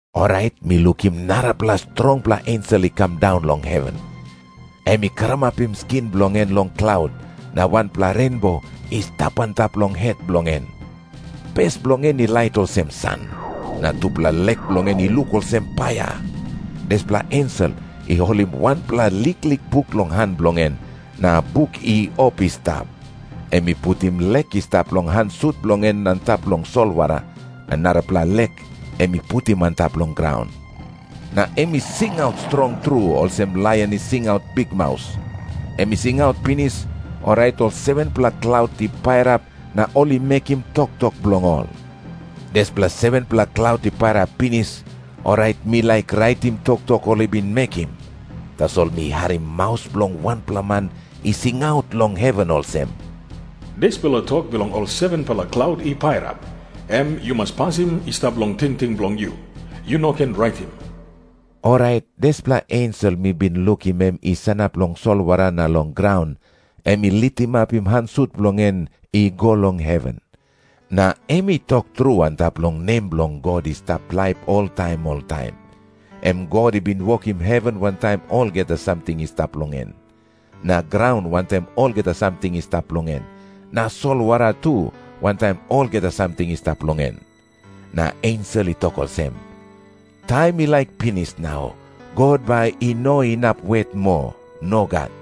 Orait mi lukim narapela strongpela ensel i kam daun long heven. Em i karamapim skin bilong en long klaut, na wanpela renbo i stap antap long het bilong en. Pes bilong en i lait olsem san, na tupela lek bilong en i luk olsem paia. Dispela ensel i holim wanpela liklik buk long han bilong en, na buk i op i stap. Em i putim lek i stap long han sut bilong en antap long solwara, na narapela lek em i putim antap long graun. Na em i singaut strong tru, olsem laion i singaut bikmaus. Em i singaut pinis, orait ol 7-pela klaut i pairap na ol i mekim toktok bilong ol. Dispela 7-pela klaut i pairap pinis, orait mi laik raitim toktok ol i bin mekim. Tasol mi harim maus bilong wanpela man i singaut long heven olsem, “Dispela tok bilong ol 7-pela klaut i pairap, em yu mas pasim i stap long tingting bilong yu. Yu no ken raitim.” Orait dispela ensel mi bin lukim em i sanap long solwara na long graun, em i litimapim han sut bilong en i go long heven, na em i tok tru antap long nem bilong God i stap laip oltaim oltaim. Em God i bin wokim heven wantaim olgeta samting i stap long en, na graun wantaim olgeta samting i stap long en, na solwara tu wantaim olgeta samting i stap long en. Na ensel i tok olsem, “Taim i laik pinis nau. God bai i no inap wet moa. Nogat.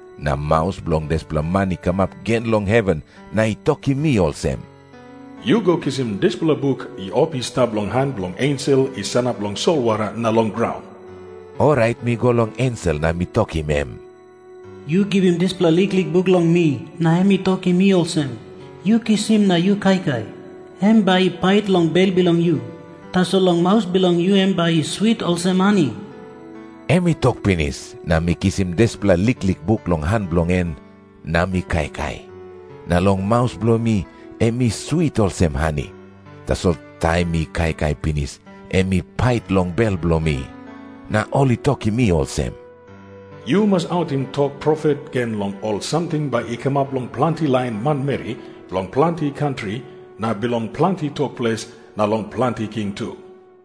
Na maus bilong dispela man i kamap gen long heven, na i tokim mi olsem, “Yu go kisim dispela buk i op i stap long han bilong ensel i sanap long solwara na long graun.” Orait mi go long ensel na mi tokim em, “Yu givim dispela liklik buk long mi.” Na em i tokim mi olsem, “Yu kisim na yu kaikai. Em bai i pait long bel bilong yu. Tasol long maus bilong yu em bai i swit olsem hani.” Em i tok pinis, na mi kisim dispela liklik buk long han bilong en, na mi kaikai. Na long maus bilong mi em i swit olsem hani. Tasol taim mi kaikai pinis, em i pait long bel bilong mi. Na ol i tokim mi olsem, “Yu mas autim tok profet gen long ol samting bai i kamap long planti lain manmeri bilong planti kantri na bilong planti tok ples, na long planti king tu.”